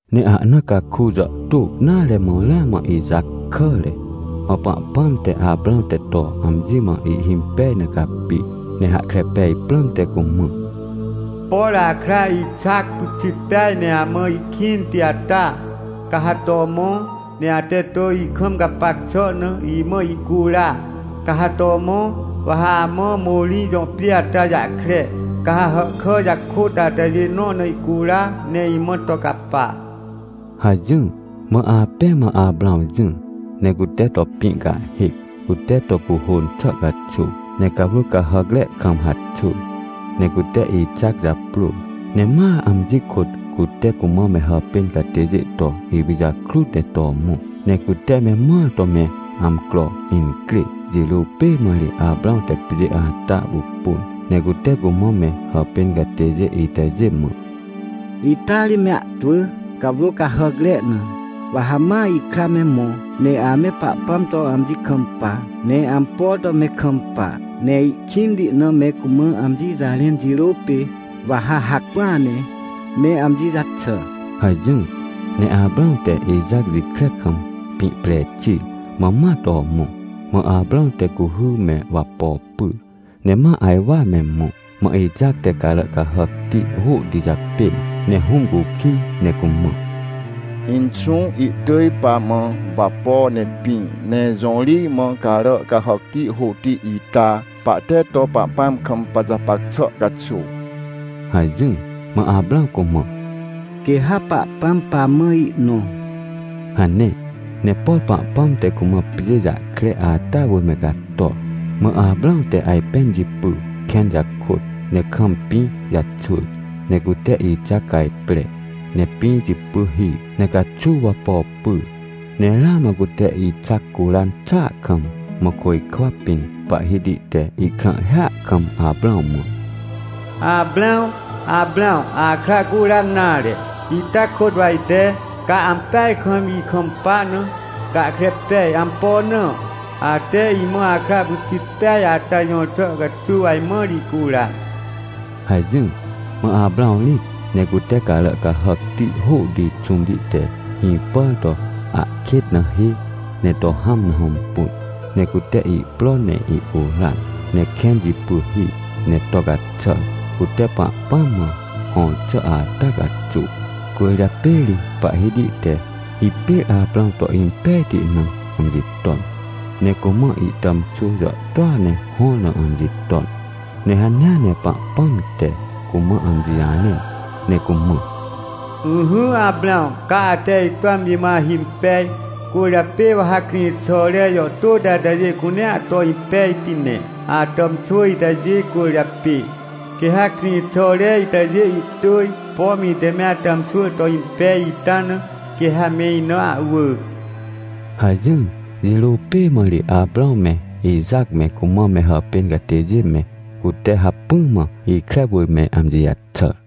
Ne ahna caku jàhtô nare mã ramã Ixac kàre. Mã Pahpãm te, Aprãw te to amji mã ihhimpej na capi, ne hahkre pej prãmte cumã: — Por akra Ixac pyxit peaj ne amã ihkĩnti ata, ca ha to mõ, ne ate to ikam gapac xà na, imã ihcura. Ca ha to mõ, wa ha amã Morij jõ pjê ata jahkre, ca ha hàhkà jakôt atajê nõ na ihcura, ne imã to capa — hajỹr. Mã apẽ mã Aprãw jỹr, ne cute to pĩ cahhêc, cute to cuhôn xà caxuw, ne cawrô cahàcre kam haxwỳr. Ne cute Ixac japrôr, ne ma amji kôt cute cumã me hàpên catêjê to ipijakrut ne to mõ. Ne cute me mõar to me amcro incrê jirô pê mã ri Aprãw te pjê ata pupun, ne cute cumã me hàpên catêjê itajê mã: — Ita ri me ahtwỳ, cawrô cahàcre na. Wa ha ma ikra me mõ, ne ame Pahpãm to amji kampa, ne ampo to me kampa, ne ihkĩnti na me cumã amji jarẽn jirô pê, wa ha hacpỹa ne me amji jaxà — hajỹr. Ne Aprãw te Ixac jikre kam pĩ pre xir mã ma to mõ. Mã Aprãw te cuhy me wapo pyr, ne ma ajwar me mõ. Mã Ixac te carà cahàcti hôhti japên, ne hũm cukij ne cumã: — Inxũ, ihtỳj pamã wapo ne pĩ, ne jõ ri mã carà cahàcti hôhti ita, pahte to Pahpãm kam pajapac xà caxuw? — hajỹr. Mã Aprãw cumã: — Quê ha Pahpãm pamã ihnõ — hane. Ne por Pahpãm te cumã pjê jahkre ata wỳr me cator, mã Aprãw te ajpẽn jipy kẽn jakôt, ne kam pĩ jaxwỳr. Ne cute Ixac cajpre, ne pĩ jipy hir. Ne caxuw wapo pyr, ne ramã cute Ixac curan xàa kam, mã côjkwa pĩn Pahhiti te ihkrãhhia kam Aprãw mã: — Aprãw! Aprãw! Akra curan nare! Ita kôt wa ite, ca ampeaj kam ikampa na, gahkre pej. Ampo na? Ate imã akra pyxit peaj ata jõr xà caxuw ajmãr ihcuran — hajỹr. Mã Aprãw rĩt, ne cute carà cahàcti hôhti xũmti te hĩpàr to ahkêt na hê, ne to hãm na hõmpun. Ne cute ihpro ne ihcuran, ne kẽn jipy hir ne to caxàr, cute Pahpãm mã hõr xà ata caxuw. Cwỳrjapê ri Pahhiti te hipêr Aprãw to impejti na amji ton, ne cumã ihtàmxwỳ jàhtôa ne hõr na amji ton. Ne hanea ne Pahpãm te cumã amji jarẽn, ne cumã: — Ỹhỹ Aprãw, ca ate ito amji mã ahimpej, cwỳrjapê wa ha krĩxàre jàhtôti atajê cunea to impejti ne, atàmxwỳ itajê cwỳrjapê. Quê ha krĩxàre itajê ihtỳj, pom ite me atàmxwỳ to impej ita na, quê ha me ina ahwỳ — hajỹr. Jirô pê mã ri Aprãw me, Ixac me, cumã me hàpên catêjê me, cute hacpỹ mã ikre wỳr me amji jaxàr.